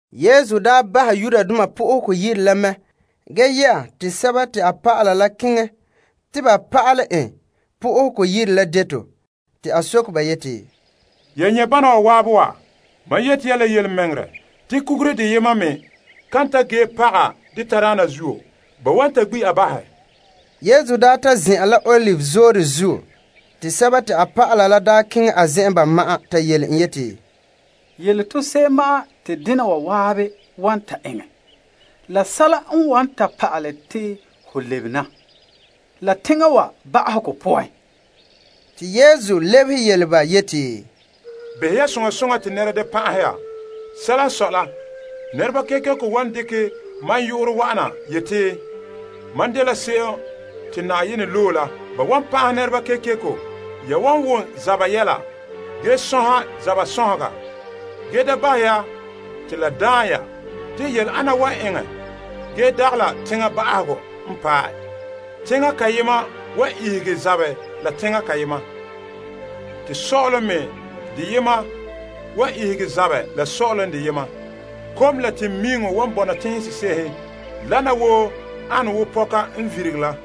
Yesu daa bahɛ Yenɛ Yire la mɛ ge yɛ'a te a dɔlɔba la daa keŋɛ a zen'en te ba pa'alɛ en Yenɛ Yire la deto. A soke ba yeti, Ya nyɛ' bana waabe wa? Mam yeti ya la yelemɛŋɛrɛ te kugure deyema me kan ta ge paga de tadaana zuo, ba wan ta gbi' a bahɛ. Yesu daa ta zin'an la Olive Zoore zuo te a dɔlɔba la daa keŋɛ a zen'en ba ma'an ta yele en yeti, Yele to se'em ma'an te dena wa zan'an wan ta eŋɛ la sɛla n wan ta pa'ale te ho lebena la teŋa wa ba'ahegɔ poan. Te Yesu lebehe yele ba yeti, Behɛ ya soŋa soŋa te nɛra da pan'ahe ya. Sɛla n sɔe la, nɛreba kekeko wan dekɛ mam yu'urɛ wa'ana yeti, mam dela Krista, se'em te Na'ayenɛ loe la. Ba wan pan'ahɛ nɛreba kekeko. Ya wan wom zaba yɛla ge sɔnha zaba sɔnhega, ge da bahɛ ya te la daan ya. Te yɛla ana wan eŋɛ ge dagɛ la teŋa ba'ahegɔ n paɛ. Teŋa kayema wan ihege zabɛ la teŋa kayema, te sɔ'ɔlom me deyema wan ihege zabɛ la sɔ'ɔlom deyema. Kom la teŋmiiŋɔ wan bɔna teŋhe sese'ehe. Wana woo ane wo pɔka n virigere la.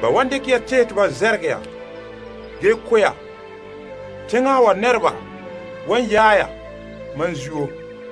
Ba wan dekɛ ya tehɛ te ba zɛrɛgɛ ya ge ko' ya. Teŋa wa nɛreba wan yaɛ ya mam zuo.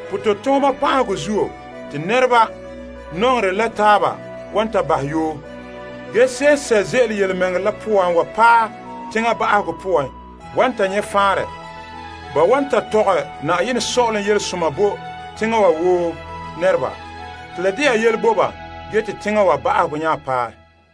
Pototooma pa'ahegɔ zuo te nɛreba nɔŋerɛ la taaba wan ta bahɛ yoo. Ge se'em n sɛ' ze'ele yelemɛŋɛrɛ la poan wa paɛ teŋa ba'ahegɔ poan wan ta nyɛ' faanrɛ. Ba wan ta mɔɔlɛ sɔ'ɔlom yelesoma bo teŋa wa woo nɛreba te la dɛna aseradaana bo teŋhe zan'an. Ge teŋa wa ba'ahegɔ wan nya paɛ.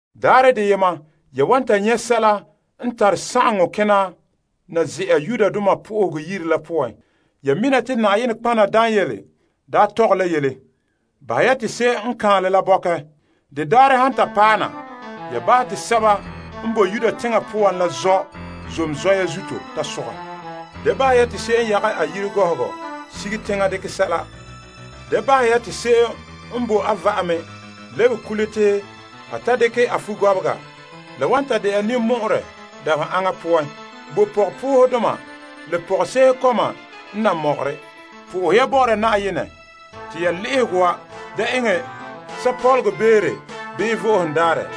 Daarɛ deyema te ya han ta nyɛ' sɛla n tare sagaŋɔ kena na ze'a toolom zen'an la poan, ya wan mina te nɔtɔgɔha Daniel daa tɔgɛ la yele. Bahɛ ya te se'em n kaanlɛ la wan bɔkɛ. La han ta paɛ na, bahɛ te sɛba n boe Yudea teŋa poan la zɔ' zom zɔya zuto ta sogɛ. Da bahɛ ya te se'em n yage a yire gɔhɔgɔ sige teŋa dekɛ sɛla. Da bahɛ ya te se'em n boe a va'ame lebe kule te a ta dekɛ a fugɔbega. La wan ta dɛna ninmɔ'ɔrɛ dabeha aŋa poan bo pɔgɔpoohedoma la pɔgɔse'ehe kɔma n nan mɔgɔre. Sohɛ ya Na'ayenɛ te ya le'ehegɔ wa de eŋɛ sapɔlɔgɔ beere bii Vo'ohogo Daarɛ.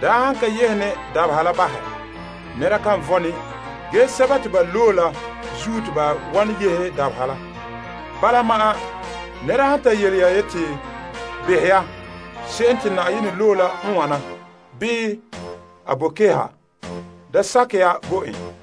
Yenɛ han ka yehe ne dabeha la fiin bahɛ, nɛnɛra kan vo'e ne. Ge sɛba te a loe la zuo, a yehe ba. Bala ma'an nɛra wan ta yele ya yeti, Behɛ ya, Krista la n wana! Bii a boe keha! Da sakɛ ya bo en.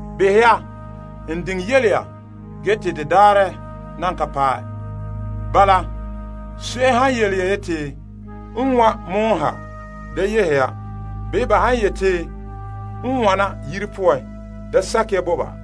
Behɛ ya, n diŋe yele ya ge te de daarɛ nan ka paɛ. Bala, se'em han yele ya yeti, A wa pɔgɔtia ha, da yehe ya. Bii ba han yeti, A wana yire poan, da sakɛ ya bo ba.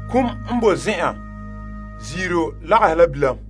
Kum n boe zen'an, ziiro lagahe la bilam.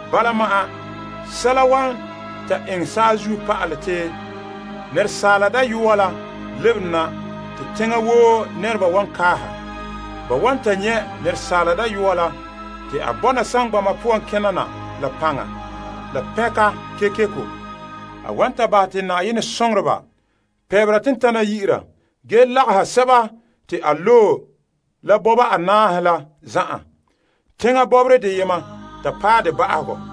Bala ma'an sɛla wan ta eŋɛ saazuo pa'alɛ te Asaala Dayɔa la lebere na te teŋa woo nɛreba wan kaaha. Ba wan ta nyɛ' Asaala Dayɔa la te a bɔna saŋgbana poan kena na la paŋa la pɛnka kekeko. A wan ta bahɛ te a soŋoreba pɛɛnbera tentana yi'ira, ge ba wa lagaha sɛba te a loe la bɔba anaahe la zan'an, teŋa bɔbɔra deyema ta paɛ de ba'ahegɔ.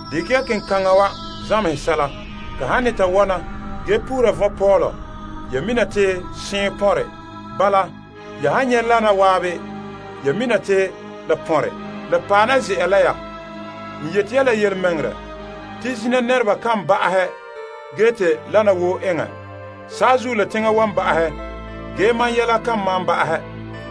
Dekɛ ya kenkaŋa wa zamehe sɛla. Ka han ne ta wɔna ge puru vɔnpɔɔlɔ, ya mina te seɔn pɔnre. Bala, ya han nyɛ' wana zan'an, ya mina te daanse'ere la pɔnre, la paɛ na ze'a la ya. N yeti ya la yelemɛŋɛrɛ te zina nɛreba kan ba'ahɛ ge te wana woo eŋɛ. Saazuo la teŋa wan ba'ahɛ, ge mam Yelehom kan malom ba'ahɛ.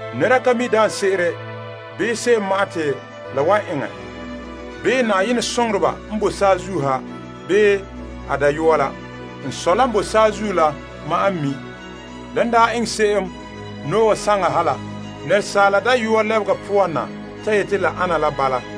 Nɛra ka mi' daanse'ere bii se'em ma'an te la wan eŋɛ. Yenɛ soŋoreba n boe saazuo ha bii a Dayɔa la ka mi'. N Sɔ' la n boe saazuo la ma'an n mi'. Lan daa ane se'em Noa saŋa ha la, Asaala Dayɔa lebega poan na ta yeti la ana la bala.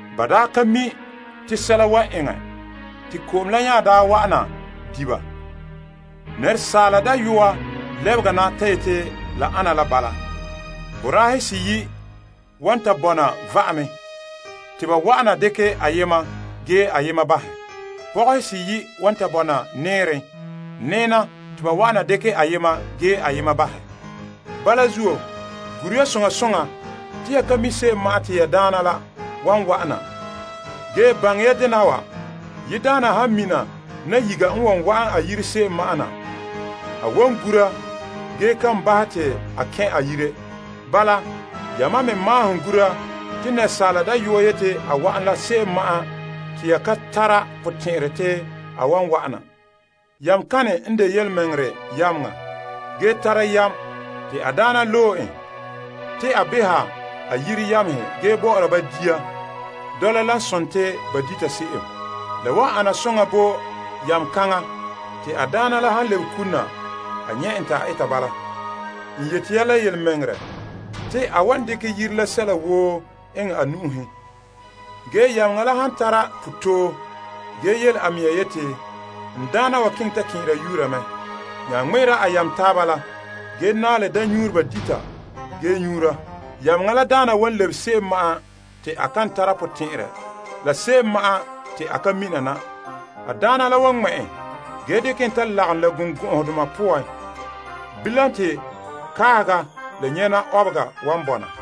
Ba ka mi' te sɛla wan eŋɛ, te ko'om la nya wa'ana di' ba. Asaala Dayɔa lebega daarɛ na ta yeti la ana la bala. Boraahe seyi' wan ta bɔna va'ame te ba wa'ana dekɛ ayema ge ayema bahɛ. Pɔgɔhe seyi' wan ta bɔna nɛɛren nɛɛna te ba wa'ana dekɛ ayema ge ayema bahɛ. Bala zuo, gure ya soŋa soŋa. Se'ere n sɔe, ya ka mi' se'em ma'an te ya Daana la wan wa'ana. Ge baŋɛ ya dena wa, yiredaana han mina nayiga n wan wa'an a yire se'em ma'an na, a wan gura ge kan bahɛ te a kɛn' a yire. Bala, ya me maahom gura. Se'ere n sɔe, Asaala Dayɔa wan wa'an la se'em ma'an te ya kan tɛn'ɛhɛ te a wan wa'ana. Yameŋa kane n de birikina la yam yameŋa se'em a daana loe en te a beha a yire yamehe ge bɔ'ɔra ba dia dɔla lan sone te ba dita se'em? La wan ana soŋa bo yameŋa kaŋa te a daana la han lebe kule na a nyɛ' en te a eta bala. N yeti ya la yelemɛŋɛrɛ te a wan dekɛ yire la sɛla woo eŋɛ a nu'uhen. Ge yameŋa la han tara potɔɔ ge yele a mea yeti, N daana wa keŋɛ ta kɛn'ɛra yuura mɛ', te a nya wan pɔhɛ ŋmɛ'ɛra a yamehe taaba la ge naɛ la daamnyuureba dita ge nyuura. Yameŋa la daana wan lebe daarɛ te a kan tara potɛn'ɛrɛ la se'em ma'an te a ka mina na. A daana la wan ŋma' en zɔnra zɔnra ge dekɛ en ta lagom birikɔgɔdoma poan, bilam te kaahega la nyɛna ɔbega wan bɔna.